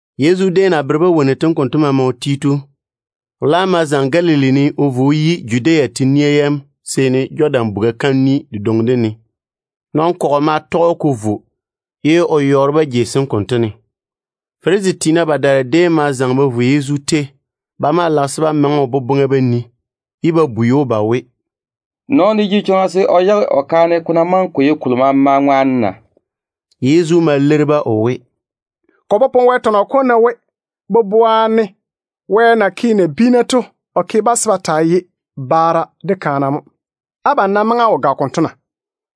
Yezu déem na bere-ba wonnu tem konto maama o ti to, o laam ma zaŋe Galili ne o vo o yi Judea laŋa kalo na wo Jɔdan buga kam bubɛ dedwoŋi dem ne to. Nɔn-kɔgɔ ma tɔge‑o ko vo, ye o yɔɔre-ba jei sem konto ne. Farisi tiina badaara déem ma zaŋe ba vo Yezu tei. Ba maa lage se ba maŋe o boboŋa ba nii, ye ba bwei‑o ba we, “Nɔɔno jege chwoŋa se o yage o kaane, ko ná maŋe ko ye kolo maama ŋwaane na?” Yezu ma leiri-ba o we, “Ko popone Wɛ tɔnɔ kom ne we, boboa ne Wɛ na ke nabiina to, o ke-ba se ba taa ye baara de kaana mo. Abam nam maŋe á wo gage konto na?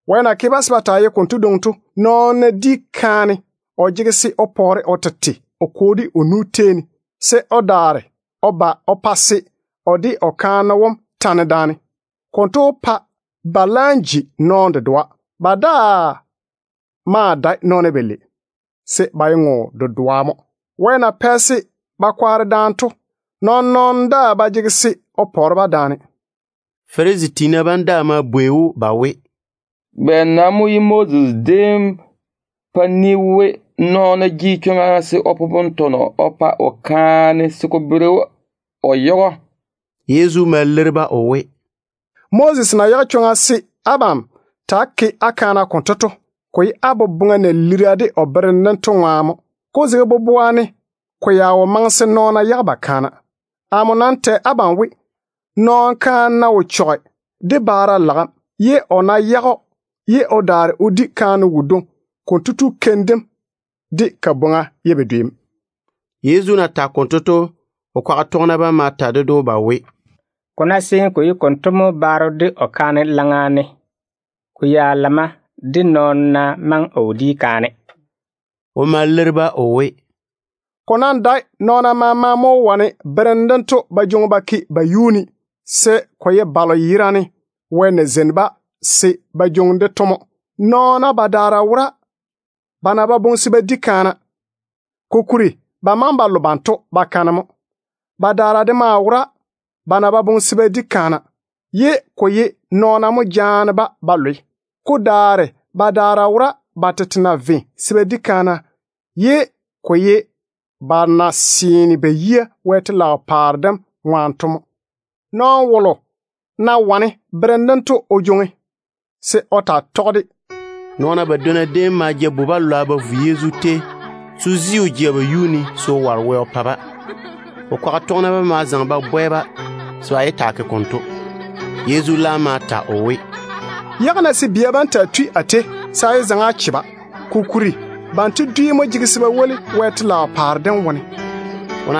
Wɛ na ke-ba se ba taa ye konto dwoŋi to, nɔɔno ná di kaane, o jege se o pwɛ o tete o kwo de o nu tei ne, se o daare o ba o pa se o de o kaane wom tane daane. Konto wó pa ba laam ji nɔɔno dedoa. Ba daa maa dae nɔɔna balei, se ba ye ŋo dedoa mo. Wɛ na pɛ se ba kwaare daane to, nɔɔn-nɔɔno daa ba jege se o pɔɔre-ba daane.” Farisi tiina bam daa ma bwei‑o ba we, “Bɛ nam mo ye Moses déem pa ni we nɔɔno jege chwoŋa se o popone tɔnɔ o pa o kaane se ko bere we o yage‑o?” Yezu ma leiri-ba o we, “Moses na yage chwoŋa se abam ta‑á ke á kaana konto to, ko ye á boboŋa na lira de o berem dem to ŋwaane mo. Ko zege boboa ne ko ya wo maŋe se nɔɔna yage ba kaana. Amo nam tɛ abam we, nɔɔno kaane ná wo chɔge de baara lagem, ye o ná yage‑o ye o daare o di kaane wodwoŋi, konto tu keim dem de kabwoŋa ye bedwe mo.” Yezu na tage konto to, o kwaga tɔgena bam ma ta ded‑o ba we, “Ko ná seene ko ye konto mo baaro de o kaane laŋa ne, nɔɔno nam ná maŋe o wo di kaane, ko ya gara.” O ma leiri-ba o we, “Ko nam dae nɔɔna maama mo wó wane berem dento ba jwoŋi ba ke ba yuu ne, se ko ye Wɛ na zeini balo yerane se ba jwoŋi-de to mo. Nɔɔna badaara wora ba na ba boŋe se ba di kaana, kokuri ba maŋe ba lo banto bakane mo. Badaara de maa wora ba na ba boŋe se ba di kaana, ye ko ye nɔɔna mo jaane-ba ba lwe. Ko daare badaara wora ba tete na ve se ba di kaana, ye ko ye ba na seene ba yia Wɛ telaao paare dem ŋwaane to mo. Nɔɔno wolo ná wane berem dento o jwoŋi, se o taa tɔge-de.” Nɔɔna badwonna déem ma ja bu-balwa ba vo Yezu tei se o zi o jea ba yum ne ye o ware Wɛ o pa-ba. O kwaga tɔgena bam ma zaŋe ba bwɛ-ba se ba yé taa ke konto. Yezu laam ma ta o we, “Yage-na se bia bam taa tui a tei, se á yé zaŋe á che-ba. Kokuri Wɛ telaao paare dem ye banto dwi nyem mo.”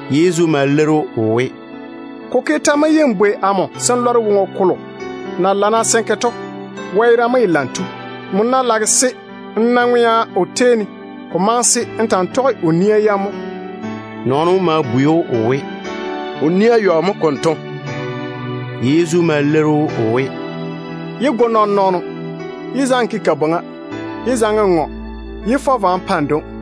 Yezu ma leiri‑o o we, “Ko ke tɛ mo ye n bwei amo se n lɔre woŋo kolo na lana se n ke to? Wɛ yerane mo ye lam tu. Nmo ná lage se n na ŋwea o tei ne, ko maŋe se n ta‑n tɔge o nia yam mo.” Nɔɔno wom ma bwei‑o o we, “O nia yɔ mo konto?” Yezu ma leiri‑o o we, “Yé go nɔɔn-nɔɔno. Yé zaŋe n ke kabwoŋa. Yé zaŋe n ŋɔ. Yé fɔ vwa n pa n dwoŋi.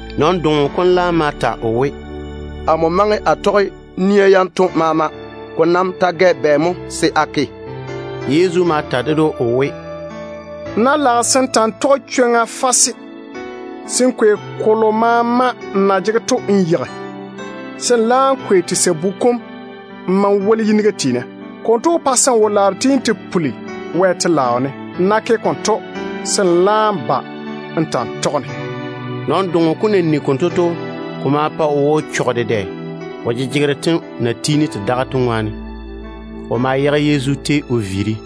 Nɔn-doŋo kom laam ma ta o we, “Amo maŋe a tɔge nia yanto maama. Ko nam ta gɛ bɛ mo se a ke?” Yezu ma ta ded‑o o we, “Nmo ná lage se n ta‑n tɔge chwoŋa fase, se n kwei kolo maama n na jege to n yeigi, se n laam kwei sabu kom n ma n woli yiniga tiina. Konto wó pa se n wo-laaro tiini te puli Wɛ telaao ne. Nmo ná ke konto, se n laam ba n ta‑n tɔge amo.” Nɔn-doŋo kom na nigi konto to, ko ma pa o yiga nyɔne dedɛ, o jejegero tem na tiini te daga to ŋwaane. O ma viiri Yezu tei ne.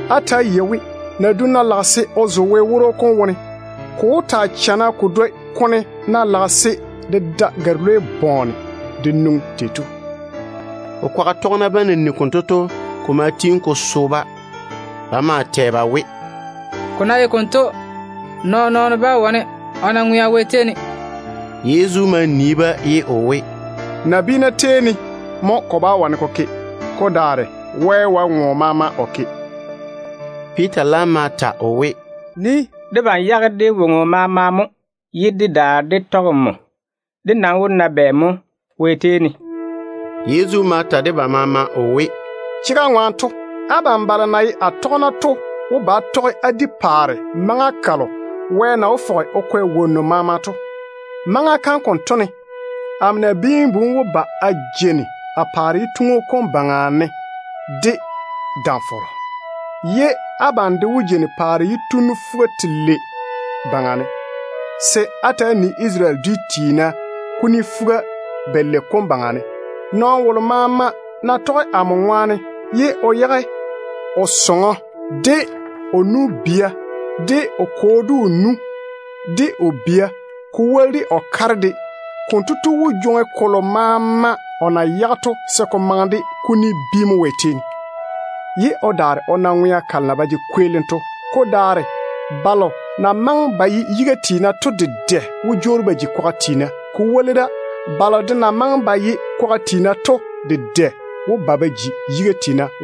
Á ta‑á yei we, nadum ná lage se o zo Wɛ woro kom wone, ko wó taa chana ko dwoi kone ná lage se de da gare-lwei bɔɔne de nwoŋi.” O kwaga tɔgena bam na nigi konto to, ko ma tiini ko so-ba. Ba maa tɛ ba we, “Ko ná ye konto, nɔɔn-nɔɔno bá wane o na ŋwea Wɛ tei ne.” Yezu ma nii-ba ye o we, “Nabiina tei ne mo ko bá wane ko ke. Ko daare Wɛ wae ŋo maama o ke.” Piita laam ma zaŋe o ta o we, “Nii. Debam yage dé woŋo maama mo ye dé daare dé tɔge nmo. Dé nam wó na bɛ nyɔɔre mo Wɛ tei ne?” Yezu ma ta de ba maama o we, “Chega ŋwaane to, abam balo na ye a tɔgena to wó ba á tɔge á di paare maŋa kalo Wɛ na wó fɔge o kwɛ wonnu maama to. Maŋa kam konto ná yia, amo Nabiin-bu wom wó ba a jeini a paare yituŋu kom baŋa ne de dam-fɔrɔ, ye abam de wó jeini paare yitunnu fuga-telei baŋa ne, se á ta‑á tei Isarele dwia fuga-yalei yam. Nɔɔno wolo maama ná tɔge amo ŋwaane, ye o yage o sɔŋɔ, de o nu-bia, de o kwo, de o nu, de o bia, ko woli de o kare de, konto tu wó jwoŋi kolo maama o na yage to se ko maŋe de kuni bi mo Wɛ tei ne, ye o daare o na ŋwea kalo na ba jege kweelim to. Ko daare balo na maŋe ba ye yiga tiina to dedɛ wó jwoori ba ji kwaga tiina. Ko woli da, balo de na maŋe ba ye kwaga tiina to dedɛ wó ba ba ji yiga tiina.”